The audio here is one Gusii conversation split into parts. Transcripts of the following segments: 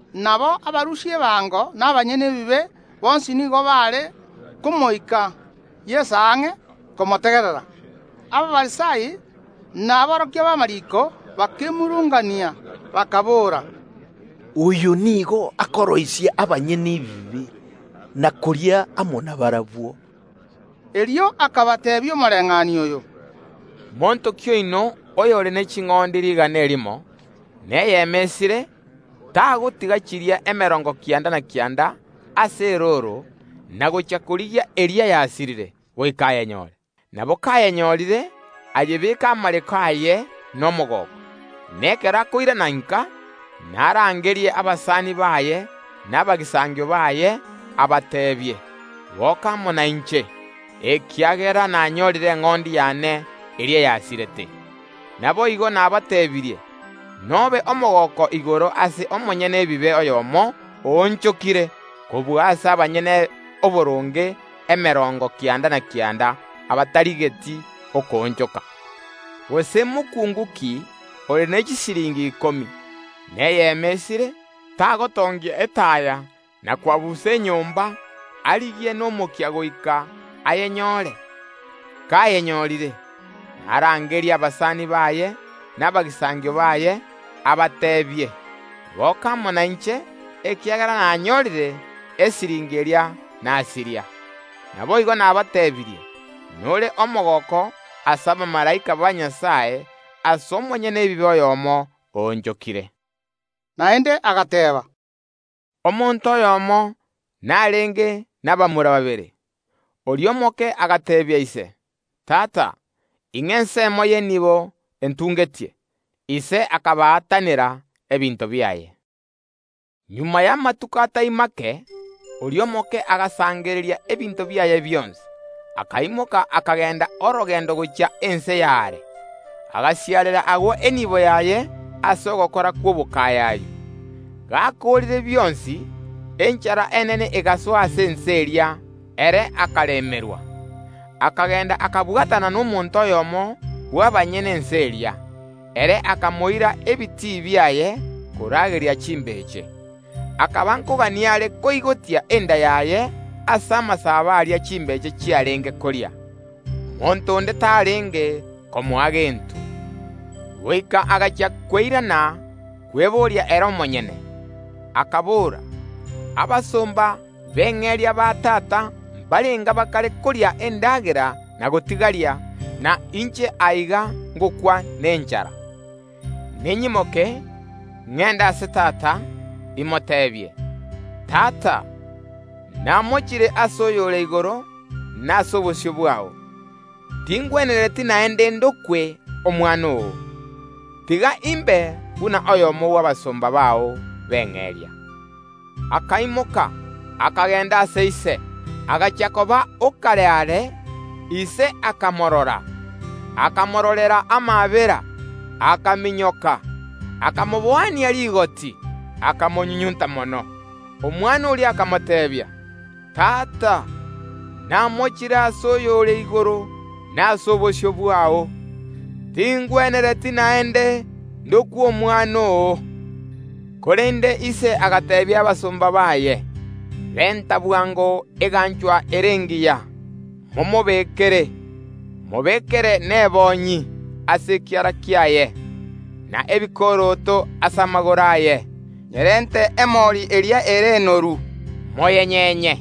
Nabo abarusia ebango na abanyene ebibe bonsi nigo baare komoika Yeso ang’e komotegerera. Abafarisai na aborokia b’amariiko bakemurungania, bakaboora, “Oyo nigo akoroisia abanyene ebibe, na koria amo nabarabwo.” Erio akabateebia omoreng’anio oyo: “Monto ki oino oyore ne ching’ondi rigana erimo, na eyemo esire, tagotiga chiria emerongo kianda na kianda ase erooro, na gochia korigia eria yasirire, goika ayenyore? Nabo kayenyorire ayebeka amareko aye nomogooko. Na ekero akoirana inka, narangerie abasani baye na abagisangio baye, abateebie: Goka amo nainche, ekiagera nanyorire eng’ondi yane eria yasirete. Naboigo nabateebirie, nobe omogooko igoro ase omonyene ebibe oyomo oonchokire, kobua ase abanyene oboronge emerongo kianda na kianda, abatarigeti okoonchoka. “Gose mokuungu ki ore ne chisiringi ikomi chi’echifeta, na eyemo esire, tagotongia etaya na kwabusa enyomba, arigie nomokia goika ayenyore? Kayenyorire, narangerie abasani baye na abagisangio baye, abateebie: Goka amo nainche, ekiagera nanyorire esiringi eria nasiria. Naboigo, nabateebirie, nore omogooko ase abamalaika ba Nyasae ase omonyene ebibe oyomo oonchokire.” Naende agateeba, “Omonto oyomo narenge nabamura babere. Oria omoke agateebia ise: Tata, ing’a ensemo y’enibo entungetie. Ise akabaatanera ebinto biaye. Magega y’amatuko atai mange oria omoke agasangereria ebinto biaye bionsi, akaimoka akagenda orogendo gochia ense y’aare; agasiarera agwo enibo yaye ase ogokora kw’obokayayu. Gakoorire bionsi, enchara enene egasoa ase ense eria, ere akaremerwa. Akagenda akabwatana nomonto oyomo bw’abanyene ense eria; ere akamoira ebitii biaye korageria chimbeche. Akaba nkogania are koigotia enda yaye ase amasabo aria chimbeche chiarenge koria; monto onde tarenge komoa gento. Goika agachia kweiranerera kweboria ere omonyene, akabora: Abasomba b’eng’eria ba tata mbarenga bakare koria endagera na gotigaria, na inche aiga ngokwa nenchara! Ninyimoke, ngende ase tata, imoteebie: Tata, namochire ase oyore igoro na ase obosio bwao, tingwenereti naende ndokwe omwana oo, tiga imbe buna oyomo bw’abasomba bao b’eng’eria. Akaimoka, akagenda ase ise. Agachia koba okare are, ise akamorora, akamororera amaabera, akaminyoka, akamoboania rigoti, akamonyunyunta mono. Omwana oria akamoteebia: Tata, namochire ase oyore igoro na ase obosio bwao, tingwenereti naende ndokwe omwana oo. Korende ise agateebia abasomba baye: Renta bwango eganchwa ere engiya, momobekere; mobekere nebonyi ase ekiara kiaye, na ebikoroto ase amagoro aye. Nyerente emori eria ere enoru, moyenyenye,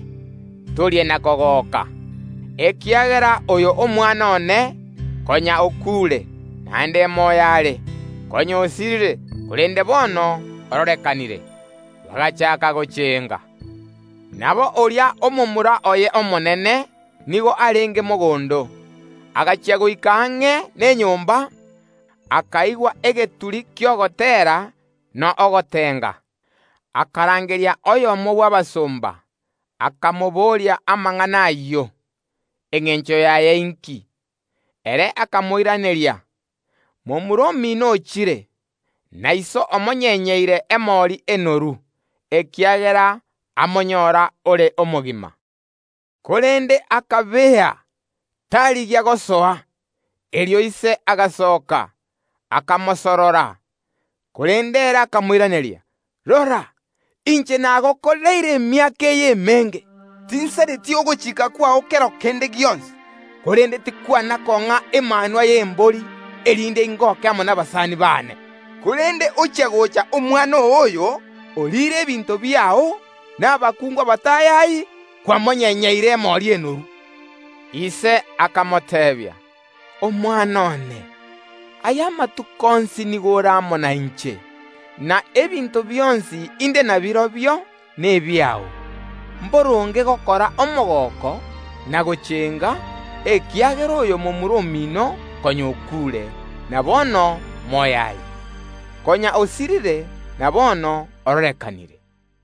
torie na kogoka, ekiagera oyo omwana one konya okuure, naende moyo are; konya osirire, korende bono ororekanire. Bagachaaka gochenga. “Nabo oria omomura oye omonene nigo arenge mogondo; agachia goika ang’e nenyomba, akaigwa egeturi ki’ogoteera na ogotenga. Akarangeria oyomo bw’abasomba, akamobooria amang’ana ayio, engencho yaye inki. Ere akamoiraneria: Momura omino ochire, na iso omonyenyeire emori enoru, ekiagera amonyora ore omogima. Korende akabea, tarigia gosoa. Erio ise agasoka, akamosorora, korende ere akamoiraneria: Rora, inche nagokoreire emiaka eye emenge, tinsareti ogochika kwao kero kende gionsi; korende tikwana kong’a emanwa y’embori, erinde ingoke amo nabasani baane. Korende ochia gocha omwana oo oyo, oriire ebinto biao nabakuungu abatayayi, kwamonyenyeire emori enoru. Ise akamoteebia: Omwana one, aye amatuko onsi nigo ore amo nainche, na ebinto bionsi inde nabirobio nebiao. Mboronge gokora omogooko na gochenga, ekiagera oyo momura omino konya okuure, na bono moyo are; konya osirire, na bono ororekanire.”